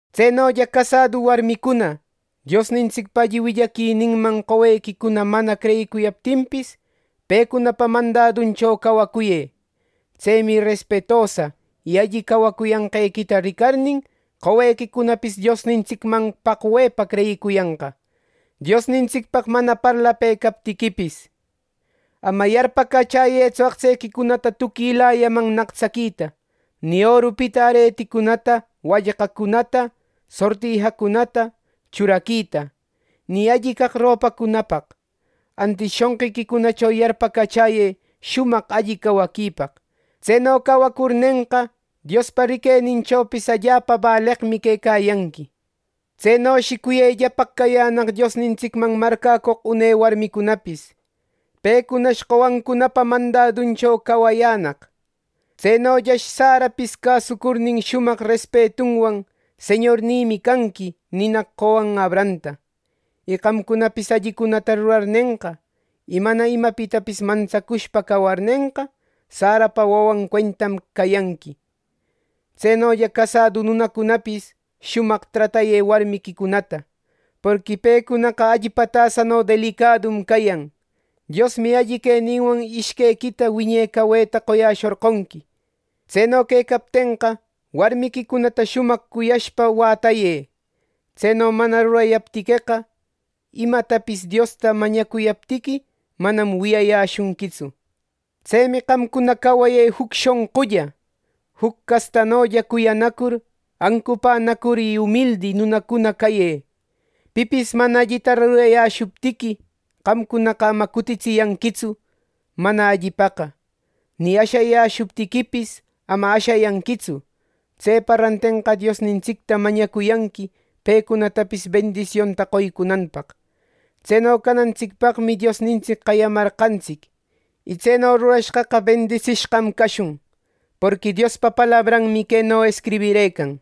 Tsenolla, casadu warmicuna, Diosnintsicpa alli willaquininman qowequicuna mana creyiyaptinpis, pecunapa mandaduncho cawacuyë. Tsemi respetosa y alli cawacuyanqequita ricarnin, qowequicunapis Diosnintsicmanna paqwepa creyicuyanqa, Diosnintsicpaq mana parlapëcaptiquipis. Ama yarpacachäyëtsu aqtsequicunata tuquilayaman nactsaquita, ni orupita areticunata, wallqacunata, sortijacunata churaquita, ni alli caq ropacunapaq. Antis shonqiquicunacho yarpacachäyë shumaq alli cawaquipaq. Tseno cawacurnenqa, Diospa riqueninchopis allapa baleqmi quecayanqui. Tsenoshi cuyellapaq cayänaq Diosnintsicman marcäcoq une warmicunapis. Pecunash qowancunapa mandaduncho cawayänaq. Tsenollash Sarapis cäsucurnin, shumaq respetunwan “Señornïmi canqui” ninaq qowan Abrahamta. Y qamcunapis allicunata rurarnenqa, y mana imapitapis mantsacushpa cawarnenqa, Sarapa wawan cuentam cayanqui. Tsenolla, casadu nunacunapis, shumaq tratayë warmiquicunata. Porqui pecunaqa allpa tasano delicadum cayan. Diosmi alli queninwan ishquequita wiñe caweta qoyäshorqonqui. Tseno quecaptenqa, warmiquicunata shumaq cuyashpa wätayë. Tseno mana rurayaptiqueqa, imatapis Diosta mañacuyaptiqui manam wiyayäshunquitsu. Tsemi qamcuna cawayë juc shonqulla. Juc castanolla cuyanacur, ancupänacur y umildi nunacuna cayë. Pipis mana allita rurayäshuptiqui, qamcunaqa ama cutitsiyanquitsu mana allipaqa. Ni ashayäshuptiquipis, ama ashayanquitsu. Tsepa rantenqa, Diosnintsicta mañacuyanqui pecunatapis bendisionta qoycunanpaq. Tseno canantsicpaqmi Diosnintsic qayamarqantsic, y tseno rurashqaqa bendisishqam cashun. Porqui Diospa palabranmi queno escribirëcan: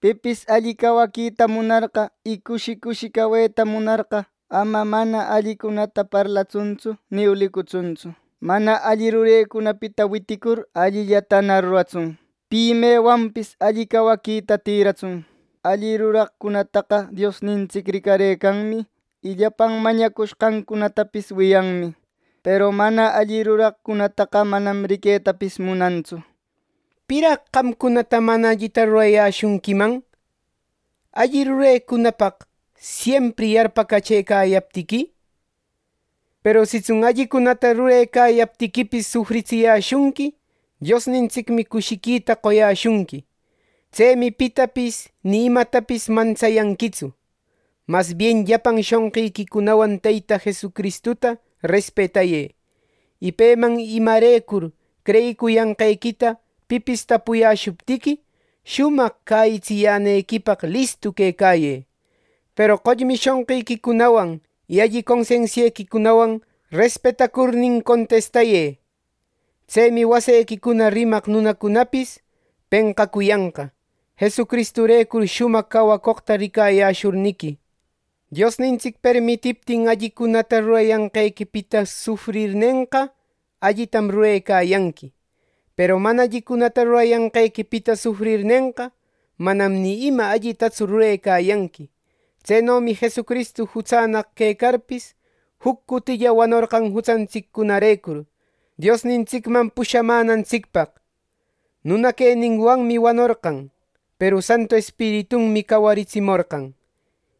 “Pipis alli cawaquita munarqa, y cushi cushi caweta munarqa, ama mana allicunata parlatsuntsu ni ulicutsuntsu. Mana alli rurecunapita witicur, allillatana ruratsun. Pi mewanpis alli cawaquita tïratsun. Alli ruraqcunataqa Diosnintsic ricarëcanmi. Y llapan mañacushqancunatapis wiyanmi; peru mana alli ruraqcunataqa, manam riquetapis munantsu”, nishpa. ¿Piraq qamcunata mana allita rurayäshunquiman, alli rurecunapaq siempri yarpacachëcayaptiqui! Peru sitsun allicunata rurecayaptiquipis sufritsiyäshunqui, Diosnintsicmi cushiquita qoyäshunqui. Tsemi pitapis ni imatapis mantsayanquitsu. Mas bien llapan shonqiquicunawan Teyta Jesucristuta respetayë. Y peman imarecur creyicuyanqequita pipis tapuyäshuptiqui, shumaq cäyitsiyänequipaq listu quecayë. Peru qollmi shonqiquicunawan, y alli consensiequicunawan respetacurnin contistayë. Tsemi wasequicuna rimaq nunacunapis penqacuyanqa, Jesucristurecur shumaq cawacoqta ricayäshurniqui. Diosnintsic permitiptin, allicunata rurayanqequipita sufrirnenqa allitam rurecayanqui. Peru mana allicunata rurayanqequipita sufrirnenqa, manam ni ima allitatsu rurecayanqui. Tsenomi Jesucristu jutsannaq quecarpis, juc cutilla wanorqan jutsantsiccunarecur, Diosnintsicman pushamänantsicpaq. Nuna queninwanmi wanorqan, peru Santu Espiritunmi cawaritsimorqan.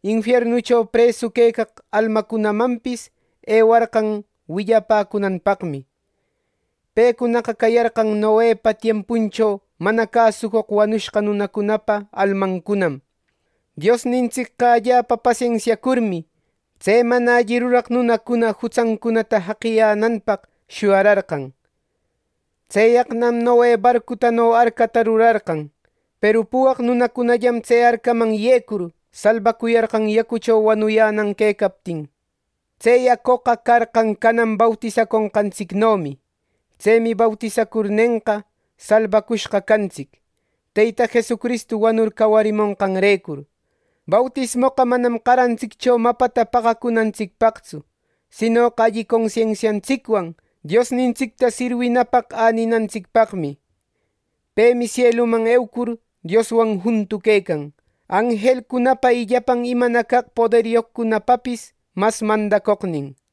Infiernucho presu quecaq almacunamanpis ewarqan willapäcunanpaqmi. Pecunaqa cayarqan Noepa tiempuncho mana cäsucoq wanushqa nunacunapa almancunam. Diosnintsicqa allapa pasensiacurmi, tse mana alli ruraq nunacuna jutsancunata jaqiyänanpaq shuyararqan. Tseyaqnam Noe barcutano arcata rurarqan. Peru puwaq nunacunallam tse arcaman yecur, salbacuyarqan yacucho wanuyänan quecaptin. Tse yacoqa carqan canan bautisaconqantsicnomi. Tsemi bautisacurnenqa, salbacushqa cantsic, Teyta Jesucristu wanur cawarimonqanrecur. Bautismoqa manam qarantsiccho mapata paqacunantsicpaqtsu, sinoqa alli consensiantsicwan Diosnintsicta sirwinapaq äninantsicpaqmi. Pemi sieluman eucur, Dioswan juntu quecan, anjelcunapa y llapan imana caq poderyoqcunapapis mas mandacoqnin.